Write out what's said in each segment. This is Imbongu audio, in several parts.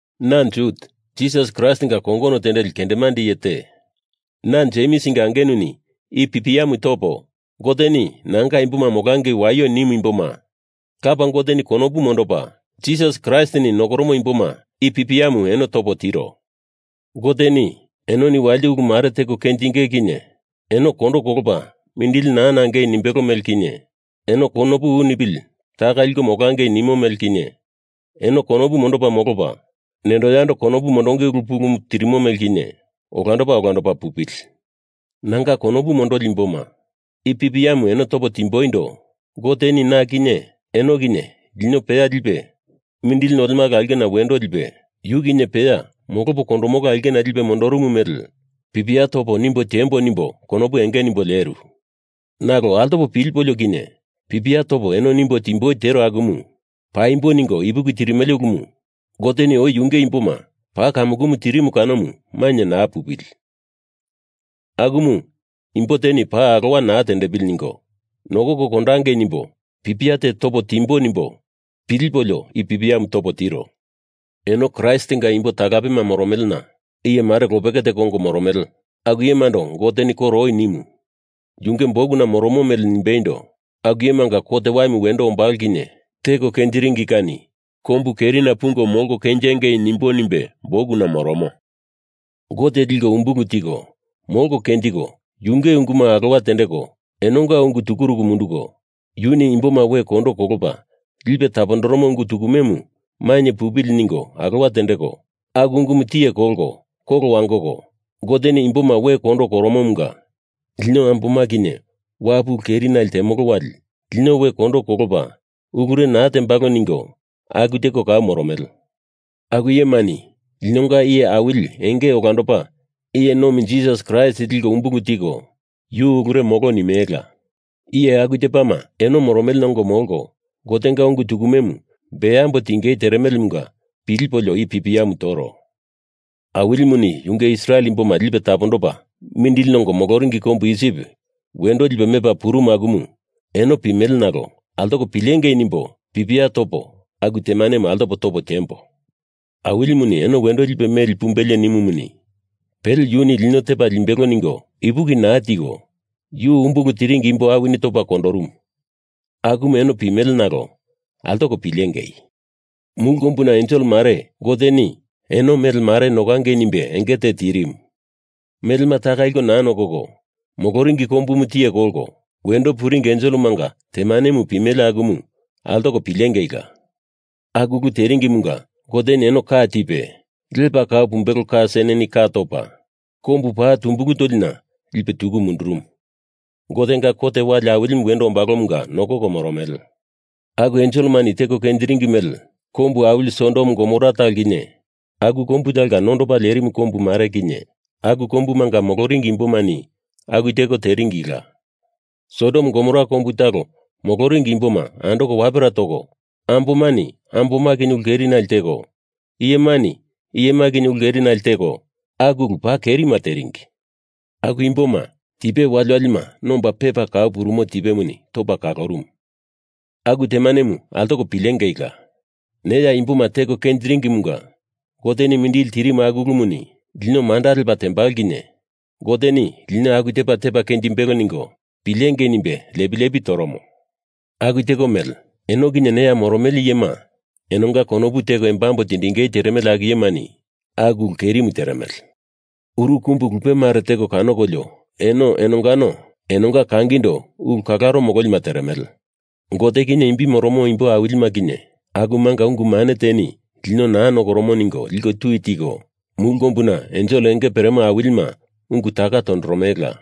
Na Jut, Jisas Kraistinga kongono tendeli kendemande iye te, na Jemsinga angenuni i pipiamu topo, Goteni nanga imboma molangei waio nimu imboma, Lapa Goteni konopu mondopa, Jisas Kraistini nokoromo imboma i pipiamu eno topo tiro, Goteni enoni walite ulu mare teko kenjinge kinye eno kondo kolopa mindili nangei naa nimbelo mele kinye, eno konopu u nipili taka liko molangei nimo mele kinye, eno konopu mondopa molopa, nendo yando konopu mondonge ulu pulumu tirimo mele kinye, olandopa olandopa pupili. Nanga konopu mondoli imboma, i pipiamu eno topo timboindo Goteni na kinye eno kinye lino tepa lipe, mindili nolemala aulkena wendo lipe, yu kinye peya molopo kondomolo aulkena lipe mondoromo mele pipia topo nimbo tiembo nimbo konopu enge nimbo leru. Nalo altopo pilipolio kinye pipia topo eno nimbo timboi tero akumu paimbo ningo ipuki tirimele ulumu Goteni oi yunge imboma paa kamukumu tirimu kanomu mainye naa pupili. Akumu imbo teni paa alowa naa tendepili ningo nokoko kondangei nimbo pipia te topo timbo nimbo pilipolio i pipiamu topo tiro. Eno Kraistinga imbo talapema moromelena iye mare lopeke teko ongo moromele, aku iyemando Goteni koro oi nimu, yunge bukuna moromo mele nimbeindo, aku iyemanga kot waimu wendo ombalo kinye teko kenjiringi kani kombu kerina pungo molko kenjengei nimbo nimbe bukuna moromo. Gote liko umbulu tiko molko kenjiko, yunge unguma alowa tendeko enonga unguma tukuruku munduko, yuni imboma we kondo kolopa lipe tapondoromo ungu tukumemu mainye pupili ningo alowa tendeko, aku ungumu tiye kolko kolo wangoko, Goteni imboma we kondo koromomunga lino amboma kinye wapu ulu keri nale temolo wali lino we kondo kolopa ulure naa tembalo ningo aku teko kau moromele. Aku iyemani linonga Iye Awili Enge Olandopa Iye Nomi Jisas Kraist liko umbulu tiko yu ulure molo nimelela. Iye aku tepama eno moromelena ongo molko Gotenga ungu tukumemu beambo tiengei teremelemunga pilipolio i pipiamu toro. Awilimuni yunge Israel imboma lipe tapondopa mindili nongo moloringi kombu Isip wendo lipe mepa purumu akumu eno pimele nalo altoko pilengei nimbo pipia topo aku temanemu altopo topo tiembo. Awilimuni eno wendo lipe meli pumbelie nimumuni, pele Yuni lino tepa limbelo ningo ipuki naa tiko yu umbulu tiringi imbo awini topa kondorumu akumu eno pimele nalo altoko pilengei! Mulu kombuna ensel mare Goteni eno mele mare nokangei nimbe enge te tirimu melema taka liko naa nokoko, moloringi kombumu tiye kolko wendo puringi enselemanga temanemu pimele akumu altoko pilengeila! Aku ulu teringimunga Goteni eno ka tipe, lepa kau pumbelo ka seneni ka topa, kombu paa tumbulu tolina lipe tuku mundurumu. Gotenga kot wali awilimu wendo ombalomunga nokoko moromele. Aku enselemani teko kenjiringi mele kombu awili Sodom Gomora talo kinye, aku kombu talonga nondopa lerimu kombu mare kinye, aku kombumanga moloringi imbomani aku teko teringila. Sodom Gomora kombu talo moloringi imboma andoko wapera toko, ambomani amboma kinye ulu kerinale teko, iyemani iyema kinye ulu keri nale teko, aku ulu paa kerima teringi. Aku imboma tipe waliwalima nomba pepa kau purumo tipemuni topa kalorumu. Aku temanemu altoko pilengeila! Neya imboma teko kenjiringimunga Goteni mindili tirimu aku ulumuni lino manda lepo temolo kinye Goteni lino aku tepa tepa kenjimbelo ningo pilengei nimbe lepi lepi toromo. Aku teko mele eno kinye neya moromele iyema enonga konopu teko embambo tindingei teremele aku iyemani aku ulu kerimu teremele. Uru kumbu lupe mare teko kanokolio eno enongano enonga kangindo ulu kalaro mololima teremele. Gote kinye imbi moromo imbo awilima kinye akumanga ungu mane teni lino naa nokoromo ningo liko tui tiko, mulu kombuna ensel enge peremo awilima ungu taka tondoromelela.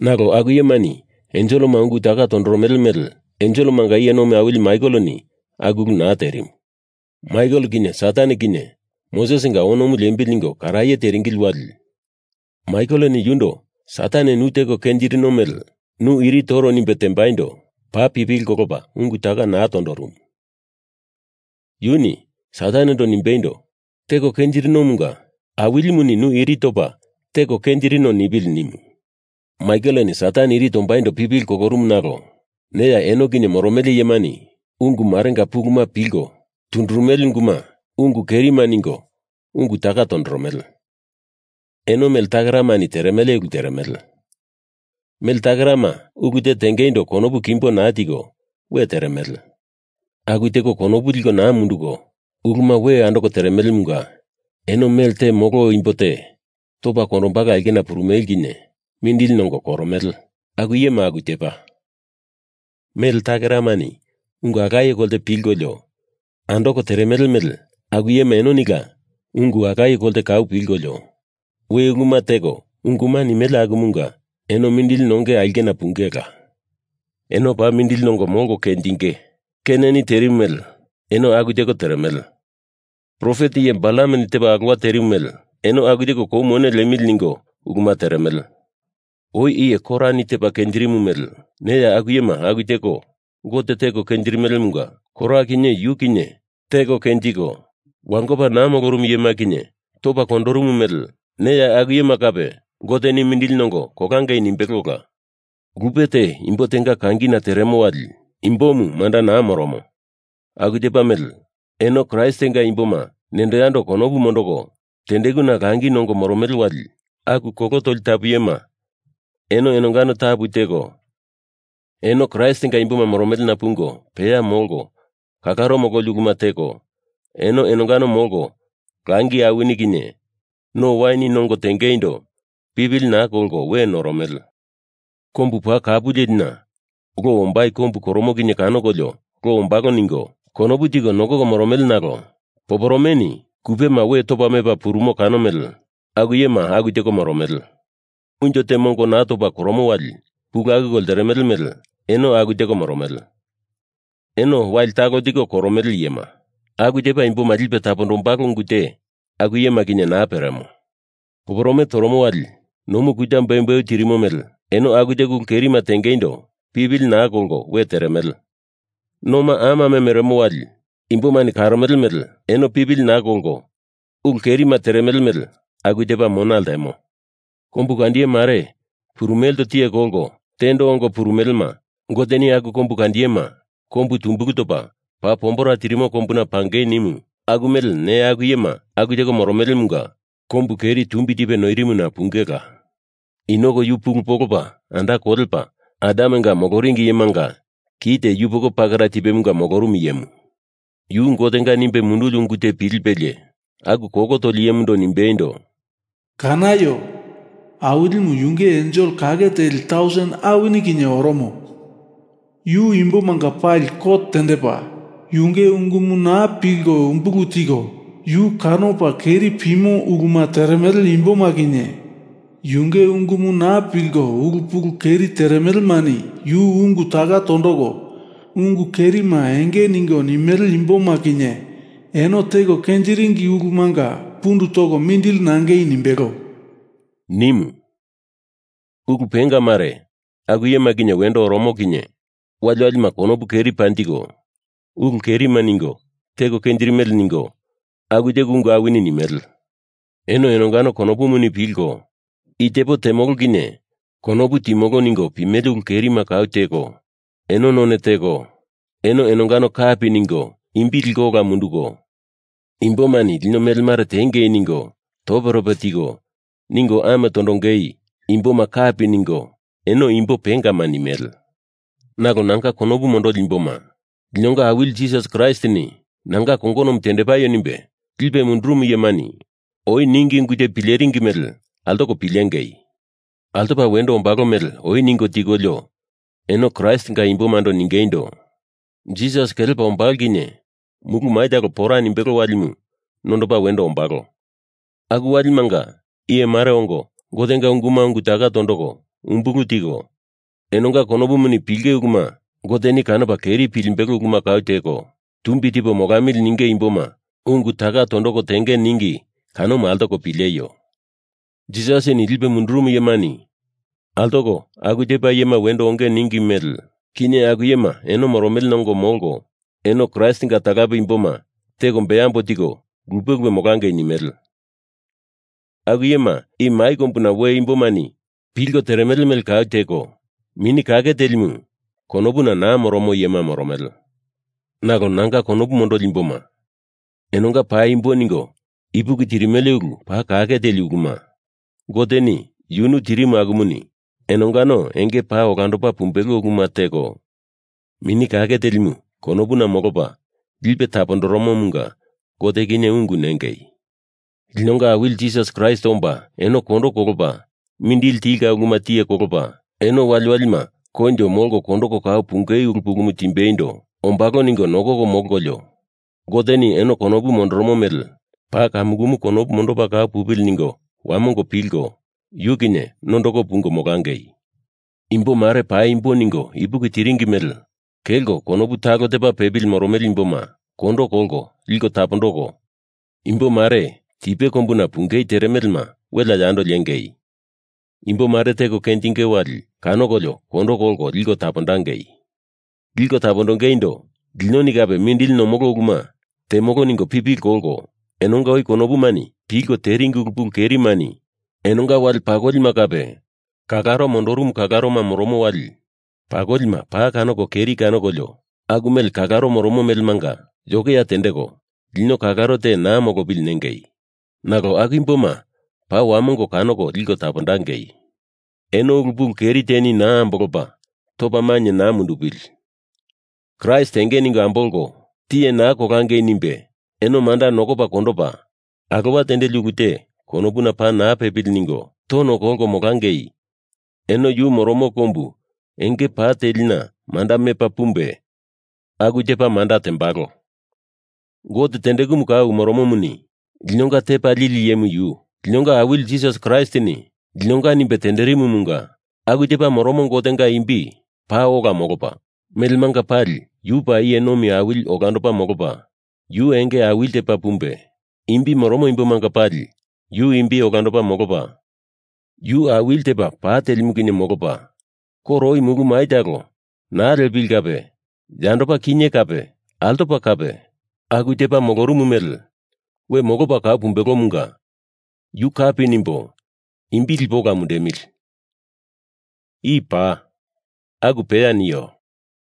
Nalo aku iyemani enselema ungu taka tondoromele mele enselemanga iye nomi awili Maikeleni aku ulu naa terimu. Maikel kinye Satan kinye Mosesinga onomu liembili ningo karaye teringili wali Maikeleni yundo Satan, nu teko kenjirino mele nu iri toro nimbe tembaindo paa pipili kolopa ungu taka naa tondorumu. Yuni Satanendo nimbeindo, teko kenjirinomunga Awilimuni nu iri topa teko kenjirino nipili nimu. Maikeleni Satan iri tombaindo pipili kolorumu nalo neya eno kinye moromele iyemani ungu marenga puluma pilko tundurumele unguma ungu kerima ningo ungu taka tondoromele. Eno mele takeramani teremele ulu teremele. Mele takerama ulu te tengeindo konopu kimbo naa tiko we teremele. Aku teko konopu liko naa munduko uluma we andoko teremelemunga eno melte molo imbo te topa kondombalo aulkena purumele kinye mindili nongo koromele. Aku iyema aku tepa: Mele takeramani ungu alaye kolte pilkolio andoko teremele mele aku iyema enonila ungu alaye kolte kau pilkolio we uluma teko unguma nimele akumunga eno mindili nonge aulkena pungela. Eno paa mindili nongo molko kenjinge! Keineni terimu mele eno aku teko teremele. Profet iye Balameni tepa alowa terimu mele eno aku teko kou mone liemili ningo uluma teremele. Oi iye Korani tepa kenjirimu mele neya aku iyema aku teko Gote teko kenjirimelemunga Kora kinye, yu kinye teko kenjiko wangopa naa molorumu iyema kinye topa kondorumu mele neya aku iyema kape Goteni mindili nongo kolangei nimbelola. Lupe te imbo tenga kangina teremo wali imbomu manda naa moromo, aku tepa mele eno Kraistinga imboma nendo yando konopu mondoko tendekuna langi nongo moromele wali aku kolo toli tapu iyema eno enongano tapu teko, eno Kraistinga imboma moromelena pungo peya molko kalaro mololi uluma teko, eno enongano molko langi awini kinye no awini nongo tengeindo pipili naa kolko we noromele. Kombu paa kapu lelina lo ombai kombu koromo kinye kanokolio lo tombalo ningo konopu tiko nokoko moromele nalo poporomeni kupema we topa mepa purumo, kano mele aku iyema aku teko moromele. Unjo te mongo naa topa koromo wali pulu akuko lteremele mele eno aku teko moromele. Eno wali talo tiko koromele iyema. Aku tepa imboma lipe tapondombalo ungu te aku iyema kinye naa peremo. Poporome toromo wali nomu kuta beumbeu tirimo mele eno aku teko ulu kerima tengeindo pipili naa kolko we teremele. Noma amame meremo wali imbomani karomele mele enoni pipili naa kolko ulu kerima teremele mele aku tepa mona ltemo. Kombukandiye mare purumelendo tiye kolko tendo ongo purumelema Goteni aku kombukandiyema kombu tumbulu topa paa pombera tirimo kombuna pangei nimu aku mele neya aku iyema aku teko moromelemunga kombu keri tumbi tipe noirimuna pungela. Enok yu pulu polopa anda kolepa Adamenga moloringi iyemanga kite yupoko pakera tipemunga molorumu iyemu. Yu Gotenga nimbe munduli ungu te pilipelie aku kolo toli iyemando nimbeindo, “Kanaio! Awilimu yunge ensel kake teli tausen awini kinye oromo. Yu imbomanga pali kot tendepa, yunge ungumu naa pilko umbulu tiko, yu kanopa keri pimo uluma teremele imboma kinye, yunge ungumu naa pilko ulu pulu keri teremelemani yu ungu taka tondoko ungu kerima enge ningo nimele imboma kinye eno teko kenjiringi ulumanga pundu toko mindili nangei nimbelo,” nimu. Ulu penga mare aku iyema kinye wendo oromo kinye waliwalima konopu keri panjiko ulu kerima ningo teko kenjirimele ningo, aku teko ungu awini nimele. Eno enongano konopumuni pilko, i tepo temolo kinye konopu timolo ningo pimele ulu kerima kau teko, eno none teko eno enongano kapi ningo imbima liko ola munduko, imbomani lino mele mare tiengei ningo toperope tiko ningo amo tondongei imboma kapi ningo eno imbo pengama nimele. Nalo nanga konopu mondoli imboma, linonga Awili Jisas Kraistini nanga kongonomu tendepaio nimbe lipe mundurumu iyemani oi ningi ungu te pileringi mele altoko pilengei! Altopa wendo ombalo mele oi ningo tikolio eno Kraistinga imbomando ningeindo, “Jisas kelepa ombalo kinye mulu mai talo pora nimbelo walimu nondopa wendo ombalo, aku walimanga iye mare ongo Gotenga unguma ungu taka tondoko umbulu tiko, enonga konopumuni pilinge uluma Goteni kanopa keri pilimbelo uluma kau teko, tumbi tipo molamili ninge imboma ungu taka tondoko tenge,” ningi kanomu altoko pileio. Jisasini lipe mundurumu iyemani altoko aku tepa iyema wendo onge ningi mele kinye aku iyema eno moromelena ongo molko, eno Kraistinga talape imboma teko beambo tiko lupe lupe molangei nimele. Aku iyema i mai kombuna we imbomani pilko teremele mele kau teko, Mini Kake Telimu konopuna naa moromo iyema moromele. Nalo nanga konopu mondoli imboma, enonga paimbo ningo ipuki tirimele ulu paa kake teli uluma Goteni yunu tirimu akumuni enongano enge paa olandopa pumbelo uluma teko, Mini Kake Telimu konopuna molopa lipe tapondoromomunga Gote kinye ungu nengei. Linonga Awili Jisas Kraist omba eno kondo kolopa mindili tilka uluma tiye kolopa, eno waliwalima koinjo molko kondoko kau punge ulu pulumu timbeindo ombalo ningo nokoko molkolio Goteni eno konopu mondoromo mele paa kamukumu konopu mondopa kau pupili ningo wamongo pilko, yu kinye nondoko pungo molangei. Imbo mare paimbo ningo ipuki tiringi mele kelko konopu talo tepa pepili moromele imboma kondo kolko liko tapondoko, imbo mare tipe kombuna pungei teremelema welea yando liengei! Imbo mare teko kenjinge wali kanokolio kondo kolko liko tapondangei. Liko tapondongeindo linoni kape mindili nomolo uluma temolo ningo pipili kolko, enonga oi konopumani pilko teringi ulu pulu kerimani enonga wale pakolima kape kalaro mondorumu kalaroma moromo wali pakolima paa kanoko keri kanokolio, aku mele kalaro moromo melemanga yokeya tendeko lino kalaro te naa molopili nengei. Nalo aku imboma paa wamongo kanoko liko tapondangei. Eno ulu pulu keri teni naa ambolopa topa mainye naa mundupili. Kraist enge ningo ambolko, tiye naa kolangei nimbe eno manda nokopa kondopa, alowa tendeli ulu te konopuna paa naa pepili ningo tono kolko molangei eno yu moromo kombu enge pa telina manda mepa pumbe, aku tepa manda tembalo Gote tendekumu kau moromomuni linonga Tepa Lili Iyemu yu, linonga Awili Jisas Kraistini linonga nimbe tenderimumunga aku tepa moromo Gotenga imbi paa ola molopa, melemanga pali yu paa iye nomi awili olandopa molopa, yu enge awili tepa pumbe, imbi moromo imbomanga pali yu imbi olandopa molopa, yu awili tepa pa telimu kinye molopa, koro oi mulu mai talo naa liepili kape yandopa kinye kape altopa kape aku tepa molorumu mele we molopa kau pumbelomunga yu kapi nimbo imbi lipo ola mundemili. I paa. Aku peya nio.